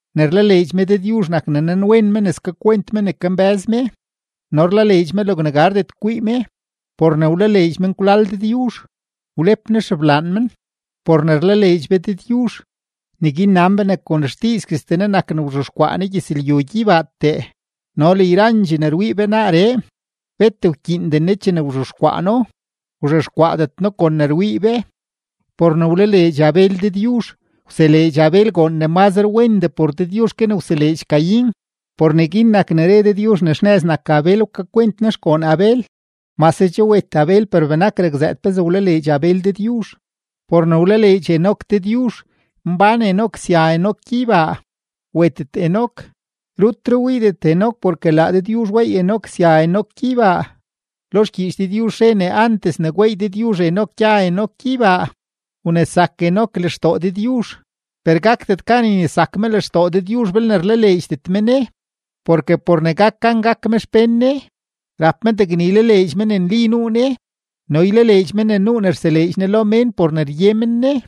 Ne rlaleedx me Dëdyuzh nak ne nanwen me ne skakwent me ne kambë́z me no rlaleedx me logne gardet kwii me. Por ne wlaleedx menkwlal Dëdyuzh wlep Ne xeblaan men. Por ne rlaleedx be Dëdyuzh neguin nan be ne kon xdiizguestee Ne nak ne wzhexkwaa Ne gyëzlyu gyeybaatee no le yrandxee ne rwii be naaree, bet wkyiinden Ne chene wzhexkwaa No, wzhexkwaadet No kon ne rwii be. Por ne wlaleedx Abel Dëdyuzh wseleedx Abel goon ne mazre wendee por Dëdyuzh ke ne wseleedx Caín, por neguin nak ne re Dëdyuzh ne xnëz nak Abel, wkakwent Ne xgoon Abel. Mase che wet Abel, per benak rakzëët pezee wlaleedx Abel Dëdyuzh. Por ne wlaleedx Enoc Dëdyuzh mbán Enoc sya Enoc gyeybaa, wetet Enoc, rutre wiidet Enoc porke laa Dëdyuzh weey Enoc sya Enoc gyeybaa. Lo xgyiich Dëdyuzh re ne antes ne gweey Dëdyuzh Enoc gya Enoc gyeybaa, wnesak Enoc lextoo Dëdyuzh. Per gakdet gan ynesak me lextoo Dëdyuzh belne rlaleedxdet me Ne; porke por ne gak gan gak me xpén Ne, rap me degne ylaleedx me ne nli nuu Ne no ylaleedx me ne nuu ne rseleedx Ne lo mén por ne rye men Ne.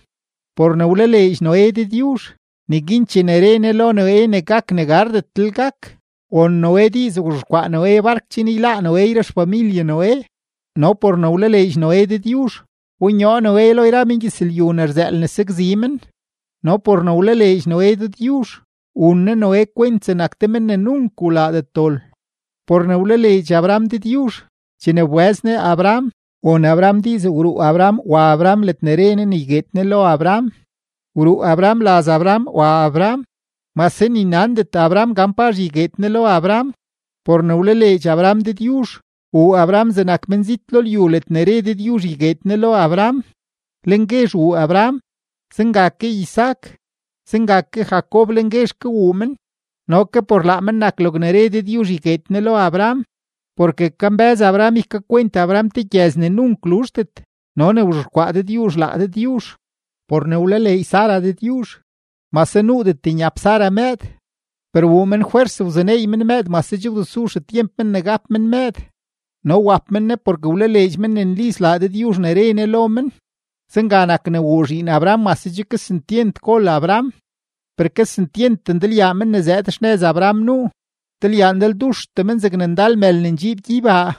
Por ne wlaleedx Noé Dëdyuzh, neguin chene re Ne lo Noé ne gak ne gardetlel gak, won Noé diiz, wzhexkwaa Noé bark chen yláá Noé yra xfamilye Noé, no por ne wlaleedx Noé Dëdyuzh, wbonyoo Noé lo yra mengyëzlyu ne rzëël ne sakzi men no por ne wlaleedx Noé Dëdyuzh, wun Ne Noé kwent zegnak te men ne nunk wlaadet dol. Por ne wlaleedx Abraham Dëdyuzh, chene wbëz Ne Abraham, won Abraham diiz wruu Abraham wa Abraham ledne re Ne ne ygueed Ne lo Abraham. Wruu Abraham laz Abraham wa Abraham, mase ni nandet Abraham gan pazh ygueed Ne lo Abraham. Por ne wlaleedx Abraham Dëdyuzh wuu Abraham zegnak menzit lo lyu ledne re Dëdyuzh ygueed Ne lo Abraham. Lenguezh wuu Abraham, zenga ke Isaac, zenga ke Jacob lenguezh ke wuu men, no ke por laa men nak logne re Dëdyuzh ygueed Ne lo Abraham. Porke kambë́z Abraham ne ykakwent Abraham te gyëz ne nunk luzhdet no ne wzhexkwaa Dëdyuzh laa Dëdyuzh. Por ne wlaleedx Sara Dëdyuzh, mase nuudet nyap Sara mëëd, per wuu men fwers wzuneey men mëëd mase che wdesu xetyemp men ne gap men mëëd no wap men ne porke wlaleedx men ne nli slaa Dëdyuzh ne re Ne lo men. Zenga nak ne wuu zhiin Abraham mase che kesentyent gol Abraham, per kesentyent ndalyaa men ne zëëd xnëz Abraham nuu, ndalyaa ndalduxtee men zegne ndal mël ne ndxiib gyeybaa,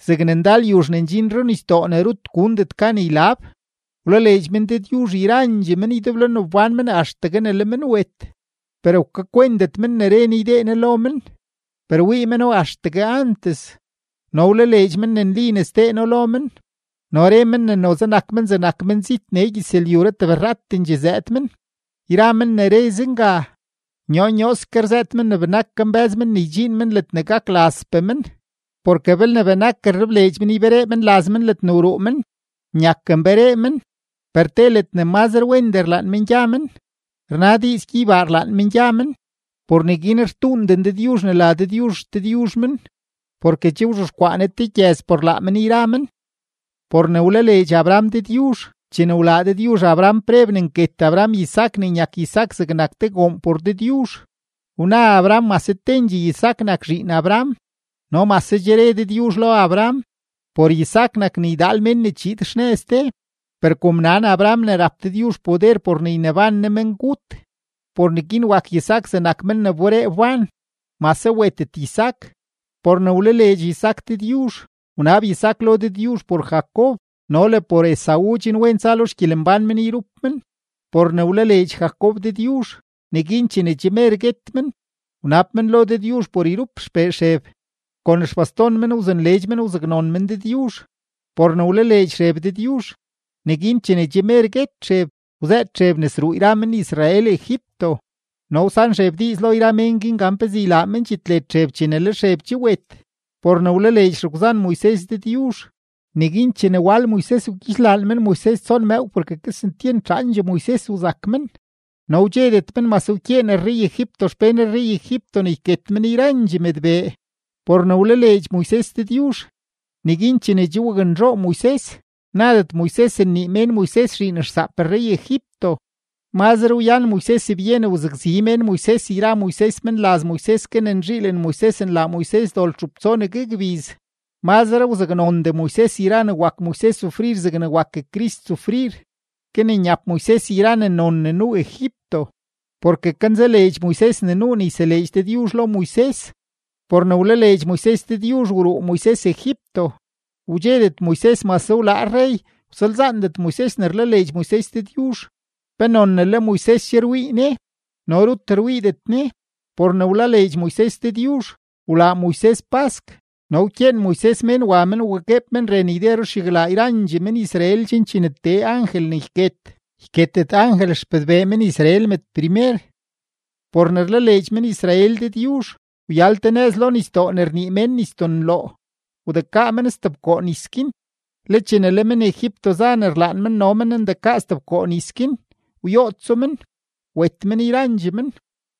zegne ndal yuzh ne ndxin runisdoo ne rut gundet gan ylab. Wlaleedx men Dëdyuzh yrandxee men ydeblo ne wbán men axtegue ne le men wet, per wkakwentet men ne re Ne ydee Ne lo men. Per wii meno axtegue antes no wlaleedx men ne nli ne sdee No lo men, no re men ne noze nak men zegnak menzit nee gyëzlyuree tebrratendxee zëëd men. Yra men ne re zenga, nyoo nyooske rzëët men ne benak kambë́z men ne ydxiin men ledne gak lazpee men. Porke belne benak rlebleedx men yberee men laz men ledne wruu men, nyak nberee men; per te ledne mazre wendee rlaan men gya men, rna diiz gyeybaa rlaan men gya men, por neguin rtuunden Dëdyuzh ne la Dëdyuzh XDëdyuzh men, porke che wzhexkwaa Ne te gyëz por laa men yra men. Por ne wlaleedx Abraham Dëdyuzh, chene wlaa Dëdyuzh Abraham preb ne yket Abraham Isaac ne nyak Isaac zegnak te goon por Dëdyuzh, wna Abraham mase tendxee Isaac nak zhiin Abraham no mase che re Dëdyuzh lo Abraham: “Por Isaac nak ne ydaal men ne chiid xnëz de.” Per kom nan Abraham ne rap Dëdyuzh poder por ne yneban Ne mengut, por neguin wak Isaac zegnak men ne wberee wban, mase wetet Isaac. Por ne wlaleedx Isaac Dëdyuzh wnab Isaac lo Dëdyuzh por Jacob no le por Esaú chen wen tsa lo xgyelembán men yrup men. Por ne wlaleedx Jacob Dëdyuzh, neguin chene che mer guet men, wnab men lo Dëdyuzh por yrup xpee Xeb, kon xbaston men wzunleedx men wzaknon men Dëdyuzh. Por ne wlaleedx Xeb Dëdyuzh, neguin chene che mer guet Xeb wzëët Xeb ne sruu yra men-Israel Egipto no wsan Xeb diiz lo yra mén guin gan pezee ylaa men dxitled Xeb chene le Xeb che wet. Por ne wlaleedx xegwzan Moises Dëdyuzh, neguin chene wal Moises wgyixlaan men Moises tson mëëw porke kesentyent zhaandxee Moises wzak men, no wdxedet men mase wkyeen rrey-Egipto xpén rrey-Egipto ne yket men yrandxee mëdbee. Por ne wlaleedx Moises Dëdyuzh, neguin chene che waknzhoo Moises nadet Moises nnii mén Moises zhiin xsaap rrey-Egipto. Mazre wyan Moises byen wzakzi mén Moises yra Moises menlaz Moises, ke ne nzhiilen Moises nlaa Moises dol txup tsonegue gbiz, mazre wzaknondee Moises yra ne wak Moises sufrir zegne wak Crist sufrir, ke ne nyap Moises yra ne non ne nuu Egipto, porke kanzaleedx Moises ne nuu ne yseleedx Dëdyuzh lo Moises. Por ne wlaleedx Moises Dëdyuzh wruu Moises Egipto, wdxedet Moises mase wlaa rrey, wsalzaandet Moises ne rlaleedx Moises Dëdyuzh, penon ne le Moises che rwii Ne, no rut rwiidet Ne. Por ne wlaleedx Moises Dëdyuzh wlaa Moises pask no wkyeen Moises mén wa men wagueeb men ren yde ruxyaglaa yrandxee men-Israel chen chene tee angel ne yket, yketet angel xpëdbee men-Israel mëdprimer. Por ne rlaleedx men-Israel Dëdyuzh wyal te nëz lo nisdoo ne rnii mén Nisdoo Nloo, wdekaa men stebkoo nis guin, le chene le men-Egipto za ne rlaan men no men ndekaa stebkoo nis guin, wyootso men, wet men yrandxee men.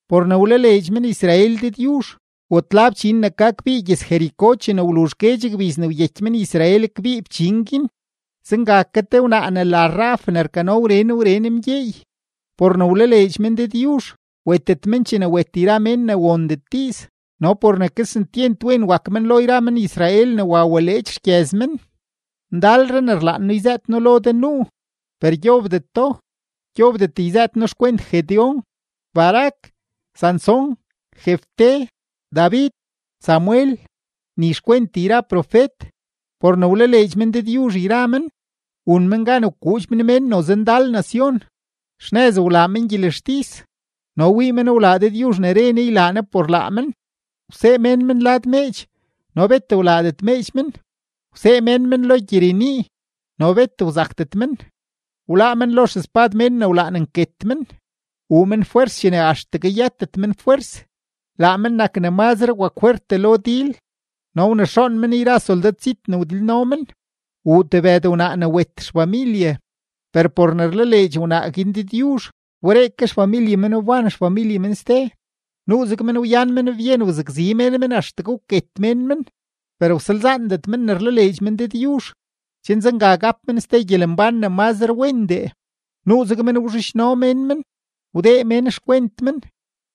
Por ne wlaleedx men-Israel Dëdyuzh watla fchin ne ka kbii gyëz-Jericó chene wluzh guedx gbiz ne wyeky men-Israel kbii fchin guin. Zenga ke te wnaa ne la Rahab ne rkano wren wren mgyeey, por ne wlaleedx men Dëdyuzh wetet men chene wet yra mén ne wondet diiz no por ne kesentyent wen wak men lo yra men-Israel ne wa waleedx xgyëz men. Ndalre ne rlaan noo yzëët noo lo de nuu, per gyobdeto. Gyobdet yzëët noo xkwent Gedeón, Barac, Sansón, Jefté, David, Samuel, ni xkwent yra profet. Por ne wlaleedx men Dëdyuzh yra men wun men gan wkuudx men mén noze ndal nacion, xnëz wlaa men gyelextis no wii men wlaa Dëdyuzh ne re Ne ne ylaa Ne por laa men, wsee mén men lad meedx no bet wlaadet meedx men, wsee mén men lo gyirenii no bet wzakdet men, wláá men lo xespad mén ne wlaan nket men, wuu men fwers chene axtegue yëtet men fwers, laa men nak ne mazre wakfwertdee lo dil no wnexoon men yra soldad zit ne wdilno men. Wuu tebëd wnaa ne wet xfamilye, per por ne rlaleedx wnaa guin Dëdyuzh, wberee ke xfamilye men wban xfamilye men ste. Nuuzeg men wyan men byen wzakzi mén men axtegue wket mén men, per wsalzaandet men ne rlaleedx men Dëdyuzh, chen zenga gap men ste gyelembán ne mazre wendee. Nuuzeg men wzhidxno mén men, wdee mén xkwent men,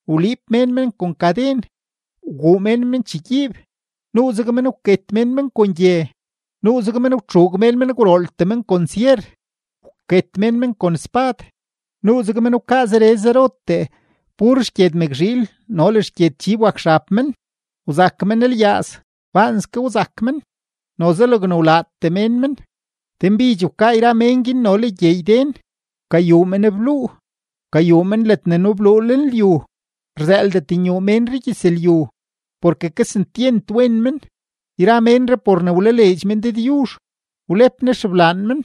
wliib mén men kon kaden, wguu mén men chegyiib. Nuuzeg men wket mén men kon gye, nuuzeg men wtxuug mén men gwrooltee men kon syer, wket mén men kon spad, nuuzeg men wkaa zere zerotee pur xgyed mëkzhiil no le xgyed chib wak xab men, wzak men lyaaz, baanske wzak men, noze logne wlaatee mén men. Denbidx wkaa yra mén guin no le gyeey den, wkayuu men bluu, wkayuu men ledne nubluu lenlyu, rzëëldet nyuu menree gyëzlyu, porke kesentyent wen men. Yra ménree por ne wlaleedx men Dëdyuzh wlep Ne xeblaan men,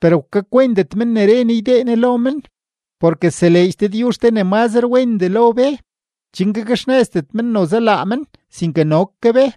per wkakwentet men ne re Ne ydee Ne lo men. Porke seleedx Dëdyuzh te ne mazre wendee lo be, chen gakxnëzdet men noze laa men, sinke no ke be.